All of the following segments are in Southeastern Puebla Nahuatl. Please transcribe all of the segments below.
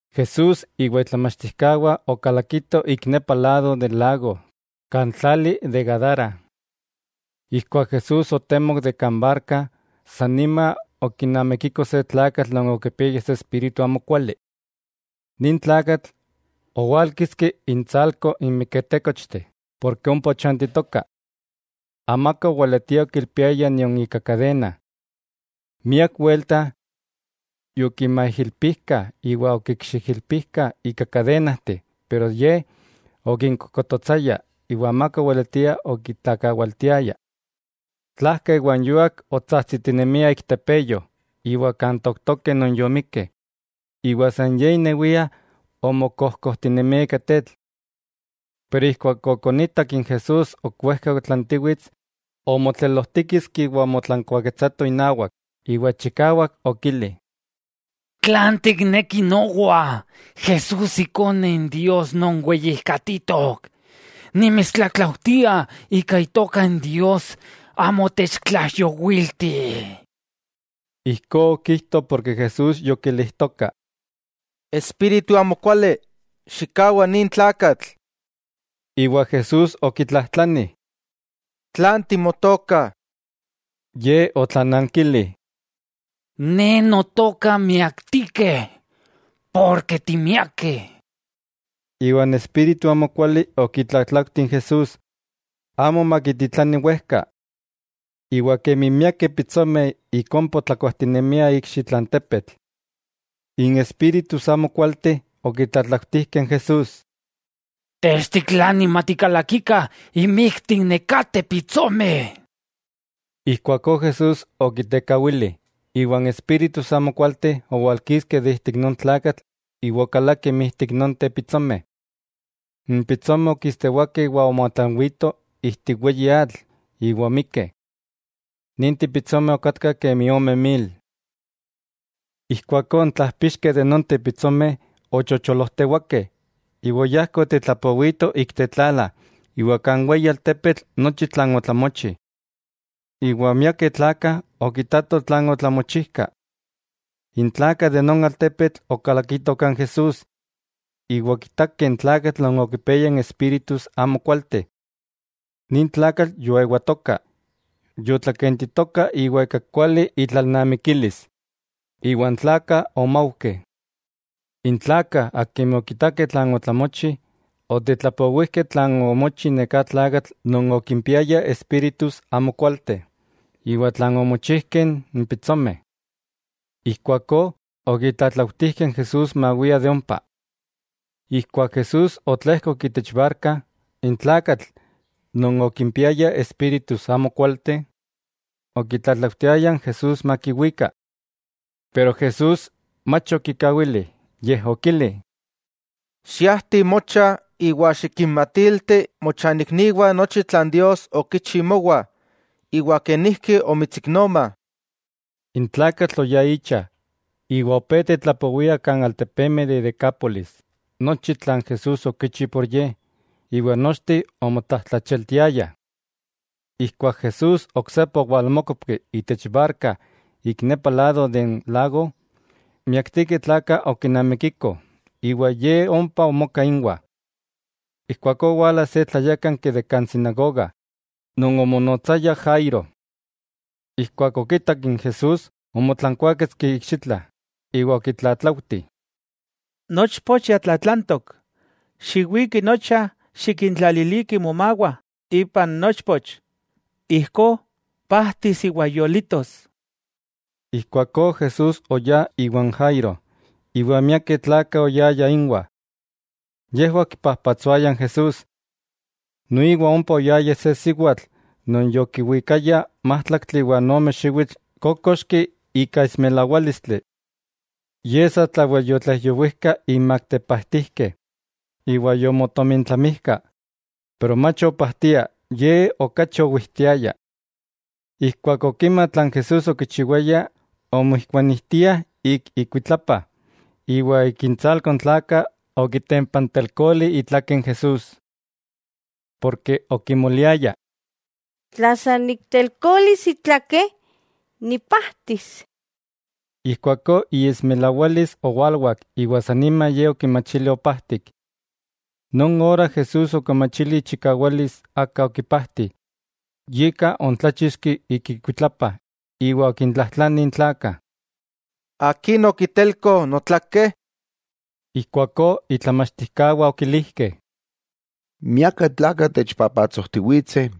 Jesús iwa itlamachtijkawah okalakitoh ik nepa lado de n lago, kan tlali de Gadara. Ijkuak Jesús otemok de kan barka, san nima okinamikiko se tlakatl non okipiaya se espíritu amokuali. Nin tlakatl owálkiski intsalko n miketékochteh, ken ompa ochantitoka. Amaka oweletia okilpiaya nion ika kadena. Miak welta yokimaijilpijkah iwa okikxiijilpijkah ika kadenajteh, pero ye okinkokototsaya iwa amaka oweletia okitlakawaltiaya. Tlajka iwa n yuak otsajtsitinemia ik tepeyo iwa kan tooktokeh non yomikkeh, iwa san ye inewia omokojkojtinemia ika tetl. Pero ijkuak okonitak n Jesús ok wejka tlantiwits, omotlelojtikiski iwa omotlankuaketsato inawak, iwa chikawak okili: —¡Tlan tikneki nowa, Jesús Ikone Dios non weyijkatitok! Nimitstlatlaujtia ika Itoka n Dios, amo techtlaijyowilti. Ijkó okijto porke Jesús yokilijtoka: —¡Espíritu amokuali, xikkawa nin tlakatl! Iwa Jesús okitlajtlani: —¿Tlan timotoka? Ye otlanankili: —Ne notoka Miaktikeh, porke timiakeh. Iwa n espíritu amokuali okitlatlaujti n Jesús, amo makintitlani wejka. Iwa kemi miakeh pitsomeh ik ompa otlakuajtinemiah ikxitla n tepetl, n espíritus amokualteh okitlatlautijkeh n Jesús: —Techtitlani matikalakikah inmijtik nekateh pitsomeh. Ijkuakó Jesús okitekawili, iwa n espíritus amokualteh owalkiskeh ijtik non tlakatl iwa okalakeh inmijtik nonteh pitsomeh. N pitsomeh okistewakeh iwa omoatlanwitoh ijtik weyi atl iwa omikkeh. Ninteh pitsomeh okatkah kemi ome mil. Ijkuakó n tlajpixkeh de nonteh pitsomeh ochocholojtewakeh iwa oyajkeh otetlapowitoh ik tetlala iwa kan weyi altepetl nochi tlan otlamochi. Iwa miakeh tlakah okitakoh tlan otlamochijka. N tlakah de non altepetl okalakitoh kan Jesús, iwa okitakeh n tlakatl non okimpiaya espíritus amokualteh. Nin tlakatl yoewatoka, yotlakentitoka iwa ika kuali itlalnamikilis, iwa n tlakah omaujkeh. N tlakah akimeh okitakeh tlan otlamochi, otetlapowijkeh tlan omochi neká tlakatl non okimpiaya espíritus amokualteh, iwa tlan omochijkeh n pitsomeh. Ijkuakó okitlatlautijkeh n Jesús mawia de ompa. Ijkuak Jesús otlejkok itech barka, n tlakatl non okimpiaya espíritus amokualteh, okitlatlaujtiaya n Jesús makiwika. Pero Jesús mach okikawili, yej okili: —Xiajti mocha, iwa xikinmatilti mochanikniwah nochi tlan Dios okichi mowa, iwa kenijki omitsiknoma. N tlakatl oyá icha, iwa opé tetlapowia kan altepemeh de Decápolis nochi tlan Jesús okichi por ye, iwa nochteh omotlajtlachialtiayah. Ijkuak Jesús oksepa owalmókopki itech barka ik nepa lado de n lago, miaktikeh tlakah okinamikikoh, iwa Ye ompa omoka inwah. Ijkuakó owala se tlayákanki de kan sinagoga, non omonotsaya Jairo. Ijkuak okitak n Jesús omotlankuáketski ikxitla, iwa okitlatlaujti: —Nochpoch ya tlatlantok, xiwiki nocha xikintlaliliki momawah ipan nochpoch, ijkó pajtis iwa yolitos. Ijkuakó Jesús oyá iwan Jairo, iwa miakeh tlakah oyayah inwa. Yejwah okipajpatsoayah n Jesús. Noiwa ompa oyaya se siwatl non yokiwikaya májtlaktli iwa ome xiwitl kókoxki ika esmilawálistli. Ye satlawel yotlaijyowijka inmak tepajtijkeh, iwa yomotomintlamijka, pero mach opajtia yej okachi oowijtiaya. Ijkuak okima tlan Jesús okichiwaya, omijkuanijtia ik ikuitlapa, iwa ik intsalko n tlakah okitempantelkoli itlake n Jesús. Porke okimoliaya: “Tla san niktelkolis itlake, nipajtis.” Ijkuakó iesmilawalis owalwak iwa san nima ye okimachili opajtik. Non ora Jesús okimachili ichikawalis aka okipajti, yika oontláchixki ik ikuitlapa iwa okintlajtlani n tlakah: —¿Akin okitelko notlake? Ijkuakó itlamachtijkawah okilijkeh: —Miakeh tlakah techpajpatsojtiwitseh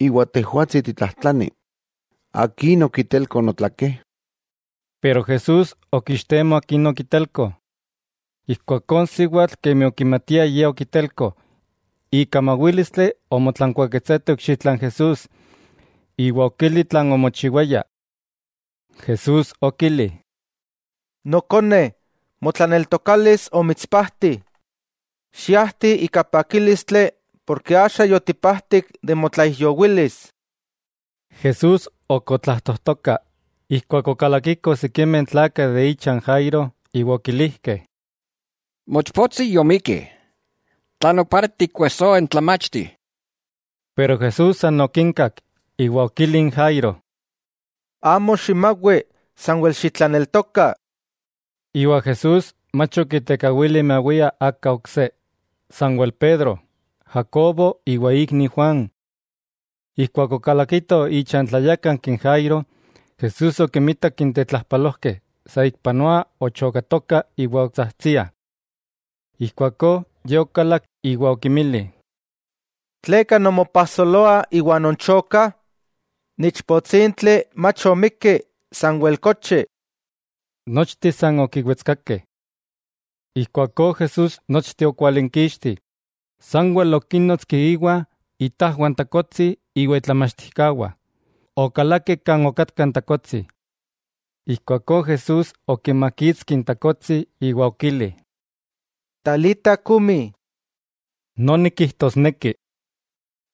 iwa Tejwatsi titlajtlani “¿Akin okitelko notlake?” Pero Jesús okiixtemo akin okitelko. Ijkuakó n siwatl kemi okimatia ye okitelko, ika mawílistli omotlankuaketsato ikxitla n Jesús, iwa okili tlan omochiwaya. Jesús okili: —Nokone, motlaneltokalis omitspajti. Xiajti ika pakílistli, porke axa yotipajtik de motlaijyowilis. Jesús ok otlajtojtoka, ijkuak okalakikoh sikimeh tlakah de icha n Jairo iwa okilijkeh: —Mochpotsi yomikki, ¿tlan ok para tikkuejsoa n tlamachti? Pero Jesús san okinkak iwa okili n Jairo: —Amo ximawi, sanwel xitlaneltoka. Iwa Jesús mach okitekawili mawia aka ok se, sanwel Pedro, Jacobo iwa ikni Juan. Ijkuak okalakito icha n tlayákanki Jairo, Jesús okinmitak n tetlajpalojkeh saikpanoa ochokatokah iwa otsajtsiah. Ijkuakó Ye okalak iwa okinmili: —¿Tleka nonmopajsoloah iwa nonchokah? N ichpotsintli mach omikki, sanwel kochi. Nochteh san okiwetskakeh. Ijkuakó Jesús nochteh okwalinkixti. Sanwel okínnotski íwa itajwah n takotsi iwa itlamachtijkawah. Okalakeh kan okatka n takotsi. Ijkuakó Jesús okimakitski n takotsi iwa okili: —Talita, kumi —noni kijtosneki: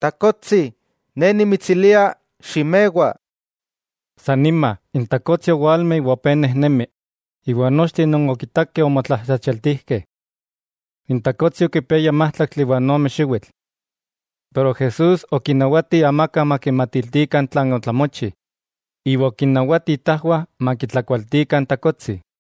¡Takotsi, Ne nimitsilia, ximewa! San nima, n takotsi owalme iwa opé nejnemi, iwa nochteh non okitakeh omotlajtlachialtijkeh. N takotsi okipiaya májtlaktli iwa ome xiwitl. Pero Jesús okinnawati amaka makimatiltikah tlan otlamochi, iwa okinnawati itajwah makitlakualtikah n takotsi.